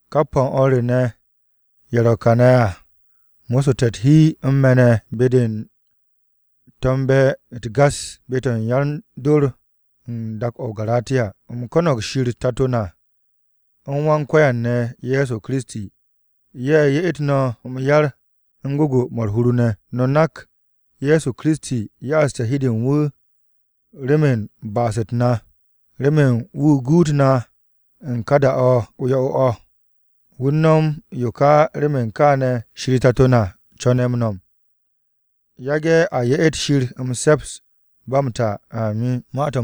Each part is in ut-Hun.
Kap o̱ u̱n o̱r re ne̱, ye̱ ro̱ kane̱ à, mo̱ssu̱te̱ u̱t-hi u̱n me̱ ne̱ be-de u̱n to̱mbe̱ u̱t-gas be-to̱ u̱n yan-dor u̱n dak-o̱ o-Garatiya. U̱m ko̱no̱g Shir Tato na u̱n Wan-Ko̱yan ne̱ Ye̱so Kiristi, ye̱ ye'et no̱ m-yar u̱n gwu̱gwu̱-mo̱ u̱r-hur ne̱. No̱ nak Ye̱so Kiristi ya'aste̱ hi u̱n de u̱n wu̱ remen ba'as-u̱t na, remen wu̱ guut na u̱n ka da-o yo̱-o̱ o̱. Wu̱ u̱n nom yo ka remen kaane̱ Shir Tato na co̱ne̱ m-no̱m. Yage̱ a ye'et Shir m-se̱ps ba m-ta! Amin.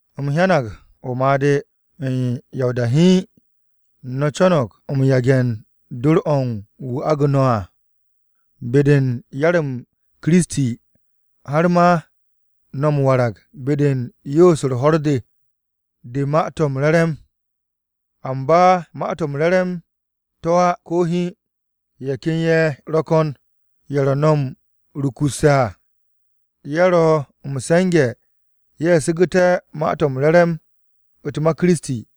U̱m hyang o-made̱. U̱n ya o-da hiin, no̱ co̱no̱g m-yage̱ dor-o̱ u̱n wu̱ agu̱ no̱ à, be-de u̱n yar-m Kiristi har m-warag be-de u̱n yoos-u̱r ho̱r-de, de Ma-to̱ m-Re̱re̱m. Amba Ma-to̱ m-Re̱re̱m to̱ á, ko̱ hiin. Ye̱ ken ye̱ ro̱ ko̱n ye̱ ro̱ no̱ m-rukurse̱ à, ye̱ ro̱ m-se̱nge̱ ye̱ su̱gu̱te̱ Ma-to̱ m-Re̱re̱m u̱t-ma Kiristi.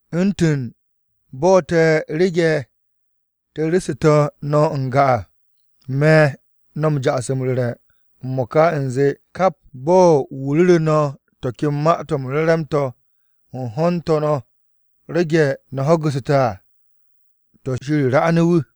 U̱ntu̱n bo̱ te̱ rege̱ te̱ ru̱ssu̱tu̱ no̱ n-ga à, me̱ no̱ m-ja'as m-ru̱re̱ m-mo̱ka u̱nze kap bo̱n wu̱ ru̱ru̱ no̱ to̱ ken Ma-to̱ m-Re̱re̱m to̱ u̱n ho̱n u̱n to̱ no̱ rege̱ no̱ ho̱gu̱ssu̱te̱ à, to̱ Shir 'ranu̱ wu̱!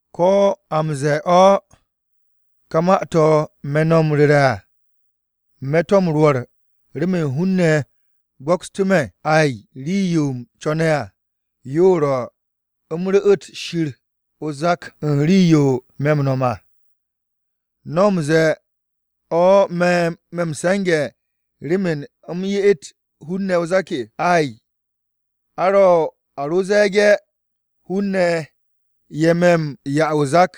¿Ko̱ a u̱n ze̱e̱ o̱, ka ma-to̱ me̱ no̱ m-ru̱re̱ à me̱ to̱ m-rwo̱r remen hun-ne̱ go̱kstú̱ me̱? Ay, rii-yo u̱m co̱ne̱ à, yo ro̱, u̱m ru̱'u̱t Shir o-zak u̱n rii-yo me̱ m-no̱m à. ¿No̱ m-ze̱e̱ o̱ me̱ m-se̱nge̱ remen u̱m ye'et hun-ne̱ o-zak? Ay, a ro ze̱e̱ge̱ hun-ne̱ ye̱ me̱ m-'ya o-zak,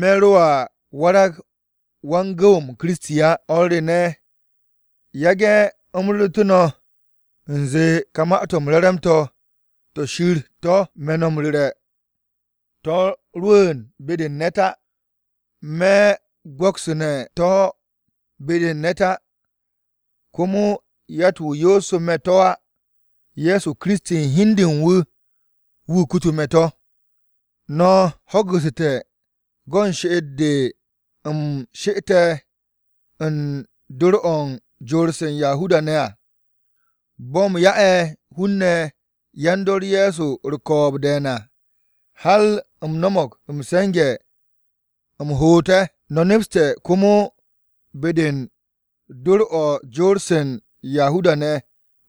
me̱ ro à warag wan-gu̱w-m Kiristi á. O̱r re ne̱, yage̱ u̱m ru̱ru̱tu̱ no̱ u̱nze ka Ma-to̱ m-Re̱re̱m to̱, to̱ Shir to̱ me̱ no̱ m-ru̱re̱ à, to̱ rwu̱u̱n be-de u̱n ne̱t á. Me̱ go̱ksu̱ne̱ to̱ be-de u̱n ne̱t á. Komo yatt-wu̱ yoosu̱ me̱ to̱ á. Ye̱so Kiristi u̱n hi u̱n de u̱n wu̱ kutu me̱ to̱. No̱ ho̱gu̱ssu̱te̱ go̱n she'et-de u̱m she'ette̱ u̱n dor-o̱ u̱n jor-se u̱n Yahuda-ne̱ à, bo̱ u̱m ya'e̱ hun-ne̱ yan-dor Ye̱so u̱r-ko̱o̱b de̱e̱n à, har u̱m no̱mo̱g m-se̱nge̱ u̱m hoot ye̱. No̱ nepste̱ komo be-de u̱n dor-o̱ jor-se u̱n Yahuda-ne̱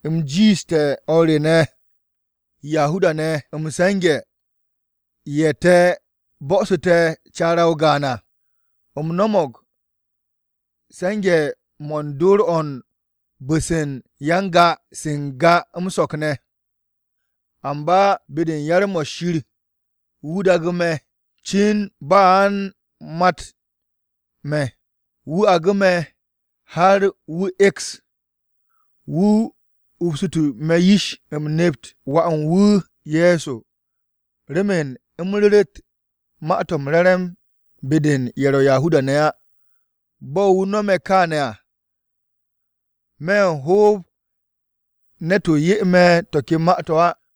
u̱m jiishte̱ o̱r re ne̱ Yahuda-ne̱ m-se̱nge̱ ye̱ te̱ bo̱su̱te̱ caara-o gaan à. U̱m no̱mo̱g se̱nge̱-mo̱ u̱n dor-o̱ u̱n bu̱-se u̱n ya-n-ga-ye̱ se n-ga m-so̱k ne̱. Amba be-de u̱n yar-mo̱, Shir wu̱ daagu̱ me̱ cin ba a u̱n m-makt me̱, wu̱ agu̱ me̱, har wu̱ e̱ks, wu̱ upsu̱tu̱ me̱ yish, u̱m nept Wà u̱n wu̱ Ye̱so, remen u̱m ru̱ru̱t Ma-to̱ m-Re̱re̱m be-de u̱n ye̱ ro̱ Yahuda-ne̱ á. Bo̱ wu̱ no̱me̱ kaane̱ à, me̱ ho̱o̱b ne̱tu̱ 'ye me̱ to̱ ken ma-to̱ á,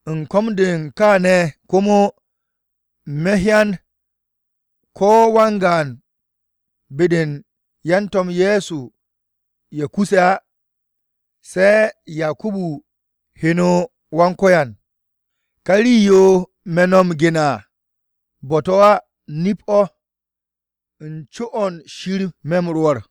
U̱n ko̱m-de u̱n kaane̱ komo, me̱ hyan ko̱ wan-gaan be-de u̱n yan-To̱m Ye̱so ye̱ kuse̱ á, se̱ Yakubu heno Wan-Ko̱yan. Ka rii-yo me̱ no̱ m-gene̱ à, bo̱-to̱ á, nip-o̱. U̱n co-o̱ Shir me̱ m-rwo̱r.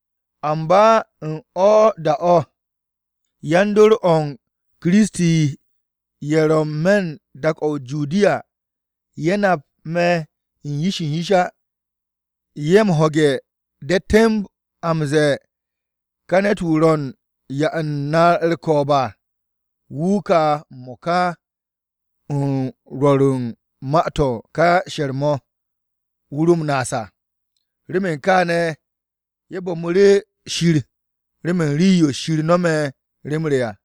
Amba u̱n o̱ ka da-o̱, yan-dor o̱ u̱n Kiristi ye̱ ro̱ n-me̱ dak-o̱ o-Judiya, ye̱ nap me̱ u̱n yish u̱n yish á. Ye̱ m-ho̱ge̱ de̱ temb a m-ze̱e̱, “Ka ne̱t-wu̱ ro̱ u̱n 'ya u̱n na u̱r-ko̱o̱b à, wu̱ ka m-mo̱ka u̱n rwo̱ru̱ u̱n Ma-to̱ m-Re̱re̱m mo̱ wu̱ ro m-naas à!” Remen kaane̱, ye̱ bo̱mu̱ru̱ Shir remen rii-yo Shir no̱me̱ rem re à.